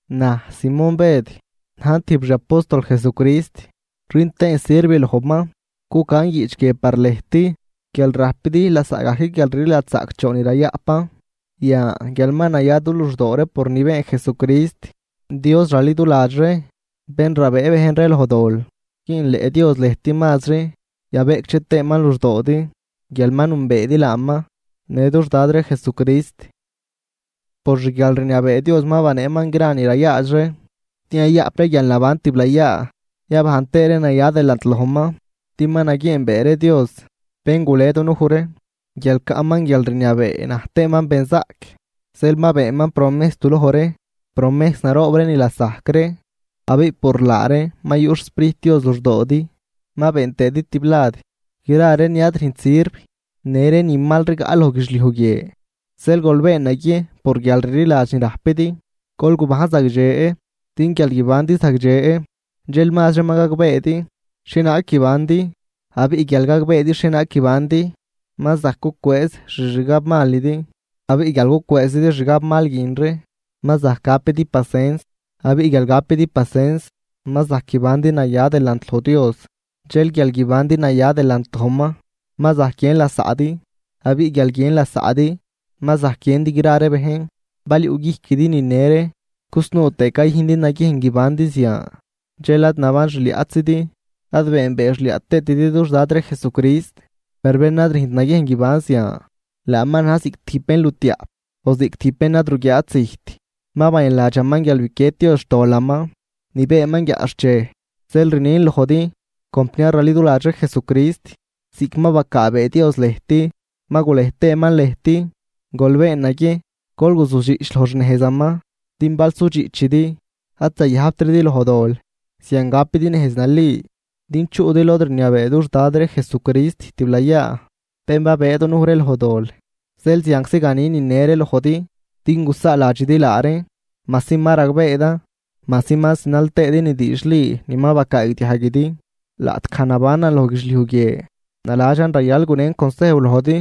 Naj, Simón Bëd, najn tijb xi apóstol Jesucrist rün tëën sirv lojman, cucan guiꞌch guie par lëjt guial rajpidi lasaꞌgajc guialrliladx zaꞌcdxoon ni rayaꞌpan, yan guial ma naya du luxdoo ree por ni been Jesucrist, Dios raliduladx ree, bén rabëë bejn ree loj dol. Güünleꞌ Dios lëjt mazri, yabeꞌcdxe tëëman luxdoodi guial ma nünbeedi laaman në dux Dad ree Jesucrist. Por xguialrniabee Dios ma baneeman gra ni rayaadx ree, din yayaꞌp ree guialnaban tiblayaa, yabajn tëë ree naya delant lojman, din ma naguieenbee ree Dios bén gule dunuj ree guial caꞌman guialrniabee naj tëëman benzaꞌc. Zeel ma beenman promejs du loj ree, promejs naroob ree ni lasajc ree, abiꞌ por laa reen ma yuꞌ xSprijt Dios luxdoodi, ma been tëëdi tiblad gra ree ni ad rüjnt sirv në ree ni mal rigaꞌ loj guidxliuj guie. Zeel gol been naguiejn por guialrliladx ni rajpidi gol gubajn zagdxe, din guial guibandi zagdxe, dxel mazri ma gagbeedi xhienaag guibandi. Abiꞌ guial gagbeedi xhienaag guibandi, ma zajc gucwëëz xixgabmalidi, abiꞌ guial gucwëëzidi xgabmal guin ree, ma zajc gapidi pasens, abiꞌ guial gapidi pasens, ma zajc guibandi naya delant loj Dios, dxel guial guibandi naya delant lojman, ma zajc guiën lasaꞌdi, abiꞌ guial guiën lasaꞌdi, ma zajc guiëndi gra ree bejn. Bal yuꞌguijquidi nine ree cusnuu tëë cayüjndi naguiejn guibandi zian, dxel ad naban xliaꞌtzidi, ad beenbee xliaꞌ tëëtidi dux Dad ree Jesucrist. Per bén ad rüjnt naguiejn guiban zian, laaman na̱j ziꞌc tijb bénlutiaꞌp o ziꞌc tijb bén ad ruguiaat zijt, ma bayanladxaman guial biquied Dios xtolaman ni beenman guiaꞌxchej. Zeel rnin lojdi, compniar raliduladx ree Jesucrist, ziꞌc ma bacaabee Dios lëjt ma gulej tëëman lëjt, gol been naguiejn gol guzudxiꞌch loj xnejzaman, din bal sudxiꞌchidi, ad zayajbtridi loj dol. Zian gapidi nejz nali din chuꞌdi lod rniabee dux Dad ree Jesucrist tiblayaa, bén babëë dunuj ree loj dol. Zeel zianczi ganin nine ree lojdi din gusaaladxidi laa reen, majsi ma ragbeedan, majsi ma zinal tëëdi ni diidxli ni ma bacaagdiajguidi. Laꞌtgaj nabanan loj guidxliuj guie, naladxan rayal gunen consejw lojdi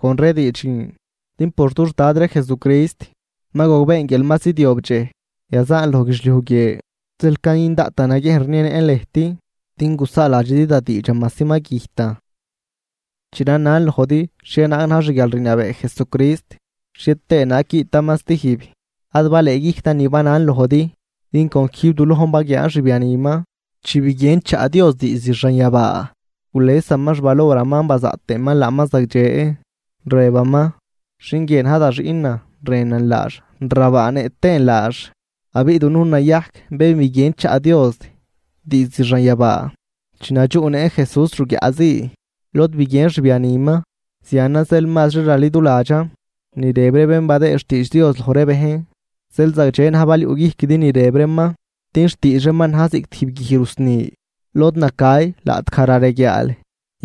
con ree diidx guin. Din por dux Dad ree Jesucrist ma gogbeen guial ma zidyob dxej yazaan loj guidxliuj guie. Zeel cayün daꞌtan naguiejn rnienëꞌn lëjt, din gusaaladxidi da diidxan majsi ma güjtan. Chi ranan lojdi xhienaag na̱j xguialrniabee Jesucrist xhie tëë naag guiꞌtaman stijb, ad balëëguijctan ni banan lojdi. Din con quijb du lojn baguiaan xbianiman chi biguien chaꞌ Dios diizd xanyabaa, gulesaman xvaloraman bazaꞌt tëëman laaman zagdxe, rëbaman: “Xin guie na̱j da xiꞌnan, rënan laax rabaanëꞌ tëën laax.” Abiꞌ dunujn nayajc bén biguien chaꞌ Dios diizd xanyabaa chi nadxuꞌnëꞌn Jesús ruguiaꞌ zii, lod biguien xbianiman. Zianan zeel mazri raliduladxan ni rëb ree bén badëëd xtiidx Dios loj ree bejn, zeel zagdxe na̱j bal yuꞌguijquidi ni rëb reeman, din xtiidx reeman na̱j ziꞌc tijb guij rusni lod nacay laꞌtgaj rareguiaal.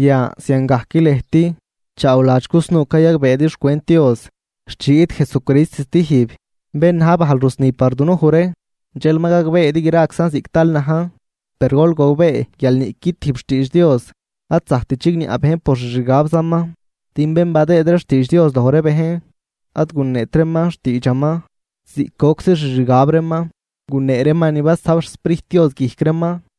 Yan ziangajc lëjt chaawladx cusnuu cayagbeedi xcwent Dios xt chi guiꞌt Jesucrist stijb, bén na̱j bajl rusni par dunuj ree, dxel ma gagbeedi graczan ziꞌc tal najn. Per gol gogbee guial niꞌqui tijb xtiidx Dios ad zajct chigniaꞌ bejn por xixgabzaman. Din bén badëëd ree xtiidx Dios loj ree bejn, ad guneet reeman xtiidxaman ziꞌc goczi xixgab reeman, gunee reeman ni basajb xSprijt Dios guijc reeman.